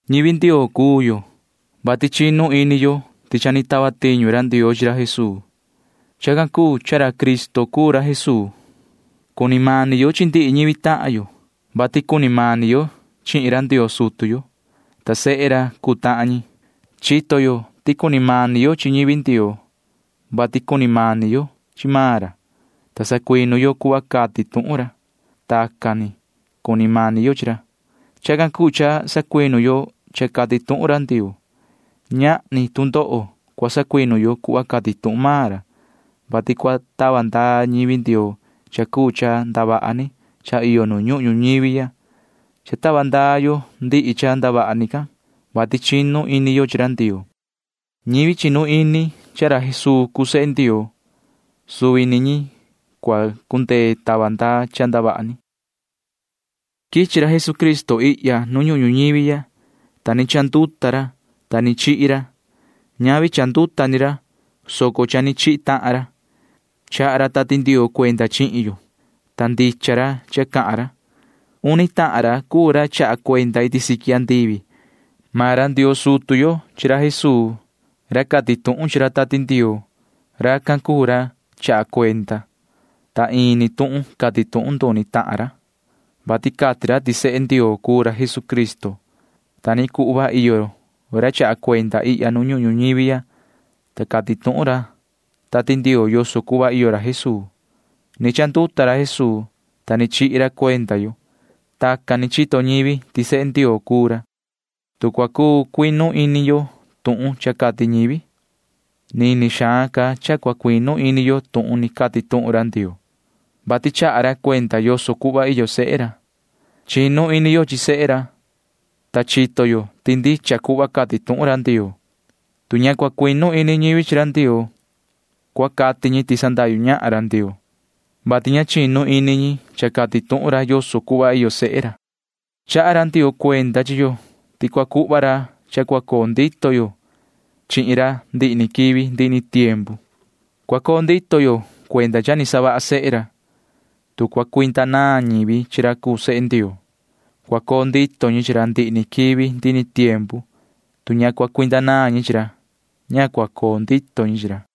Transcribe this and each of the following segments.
Ñivi Ndioo cuu yo, vati chinu ini yo ti cha ni tava tiñu ra Ndioo chi ra Jesuu. Chacan cuu cha Cristo cuu ra Jesuu. Cuni mani yo chi ndihi ñivi tahan yo, vati cuni mani yo chihin ra Ndioo sutu yo, ta sehe ra cuu tahan ñi. Chito yo ti cuni mani yo chi ñivi Ndioo, vati cuni mani yo chi maan ra, ta sacuinu yo cuhva cati tuhun ra. Tacan ni cuni mani yo chi ra. Chacan cuu cha sacuinu yo cha cati tuhun ra Ndioo. Ñahni tu ndoho cua sacuinu yo cuhva cati tuhun maan ra, vati cua tava ndaa ndihi yo cuu ñivi Ndioo chi cha ndavaha ni cha iyo nu ñuhun ñuñivi ya. Cha tava ndaa yo ndihi cha ndavaha ni can, vati chinu ini yo chi ra Ndioo. Suvi ñivi chinu ini ti ra Jesuu cuu sehe Ndioo―suvi ñi cuu ñi cua cundee tava ndaa cha ndavaha ni can. Quichi ra Jesucristo ihya nu ñuhun ñuñivi ya, ta ni chanduta ra, ta ni chihi ra. Ñavi cha ni chanduta ni ra, soco cha ni chihi tahan ra. Chaha ra Tati Ndioo cuenda chihin yo, ta ndicha ra cha cahan ra. Uni tahan ra cuu ra chaha cuenda iti siqui andivi. Maan ra Ndioo sutu yo chi ra Jesuu ra cati tuhun chi ra Tati Ndioo. Racan cuu ra chaha cuenda, ta ini tuhun cati tuhun nduni tahan ra, vati cati ra ti sehe Ndioo cuu ra Jesucristo. Ta ni cuhva iyo ra chaha cuenda ihya nu ñuhun ñuñivi ya, ta cati tuhun ra Tati Ndioo yoso cuhva iyo ra Jesuu. Ni chanduta ra Jesuu, ta ni chihi ra cuenda yo. Tacan ni chito ñivi ti sehe Ndioo cuu ra. Tu cua cuu cuinu ini yo tuhun cha cati ñivi, nini xaan ca cua cuinu ini yo tuhun ni cati tuhun Ndioo, vati chaha ra cuenda yoso cuhva iyo sehe ra. Chinu ini yo chi sehe ra, ta chito yo ti ndicha cuhva cati tuhun ra Ndioo. Tu ña cua cuinu ini ñivi chi ra Ndioo, cua cati ñi ti sandahyu ñahan ra Ndioo, vati ña chinu ini ñi cha cati tuhun ra yoso cuhva iyo sehe ra. Chaha ra Ndioo cuenda chi yo ti cua cuhva ra cha cua coo ndito yo chihin ra ndihi ni quivi ndihi ni tiempu. Cua coo ndito yo cuenda cha ni savaha sehe ra. Tu cua cuinda naan ñivi chi ra cuu sehe Ndioo, cua coo ndito ñi chi ra ndihi ni quivi ndihi ni tiempu. Tu ña cua cuinda naan ñi chi ra, ña cua coo ndito ñi chi ra.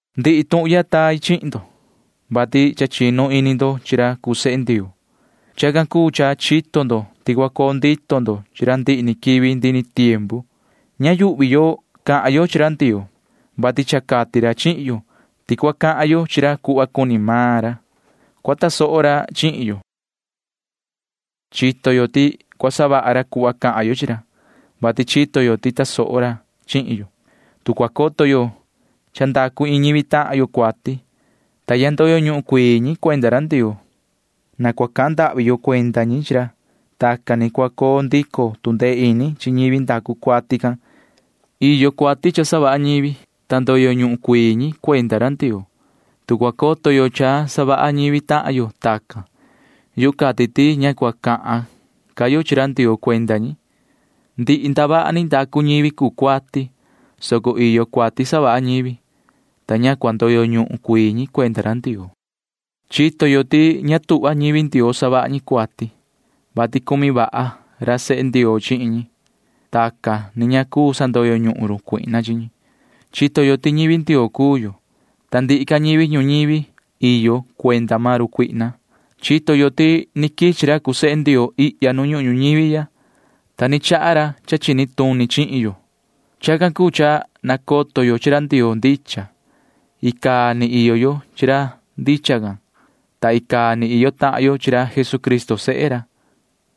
Ndihi tuhun ya tai chihin ndo, vati cha chinu ini ndo chi ra cuu sehe Ndioo. Chacan cuu cha chito ndo ti cua coo ndito ndo chi ra ndihi ni quivi ndihi ni tiempu. Ña yuhvi yo cahan yo chi ra Ndioo, vati cha cati ra chihin yo ti tu cua cahan yo chi ra cuhva cuni maan ra, cua tasoho ra chihin yo. Chito yo ti cua savaha ra cuhva cahan yo chi ra, vati chito yo ti tasoho ra chihin yo. Tu cua coto yo ti cha ndacu iin ñivi tahan yo cuati, ta ña ndoyo ñuhun cuii ñi cuenda ra Ndioo, na cua cahan ndahvi yo chi ra cuenda ñi. Tacan ni cua coo ndico tu ndee ini chi ñivi ndacu cuati can. Iyo cuati cha savaha ñivi, ta ndoyo ñuhun cuii ñi cuenda ra Ndioo. Tu cua coto yo cha savaha ñivi tahan yo chacan, yu cati ti ña cua cahan ca yo chi ra Ndioo cuenda ñi. Ndihi ndavaha ni ndacu ñivi cuu cuati, soco iyo cuati savaha ñivi, ta ña cua ndoyo ñuhun cuii ñi cuenda ra Ndioo. Chito yo ti ña tuhva ñivi Ndioo savaha ñi cuati, vati cumi vaha ra sehe Ndioo chihin ñi. Tacan ni ña cuu sandoyo ñuhun run cuihna chi ñi. Chito yo ti ñivi Ndioo cuu yo, ta ndihi ca ñivi ñuñivi iyo cuenda maan run cuihna. Chito yo ti ni quichi ra cuu sehe Ndioo ihya nu ñuhun ñuñivi ya, ta ni chaha ra cha chini tuni chihin yo. Chacan cuu cha nacoto yo chi ra Ndioo ndicha. Icaa ni iyo yo chi ra ndicha can, ta icaa ni iyo tahan yo chi ra Jesucristo sehe ra.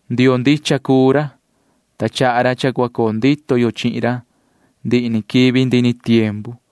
Ndioo ndicha cuu ra, ta chaha ra cha cua coo ndito yo chihin ra ndihi ni quivi ndihi ni tiempu.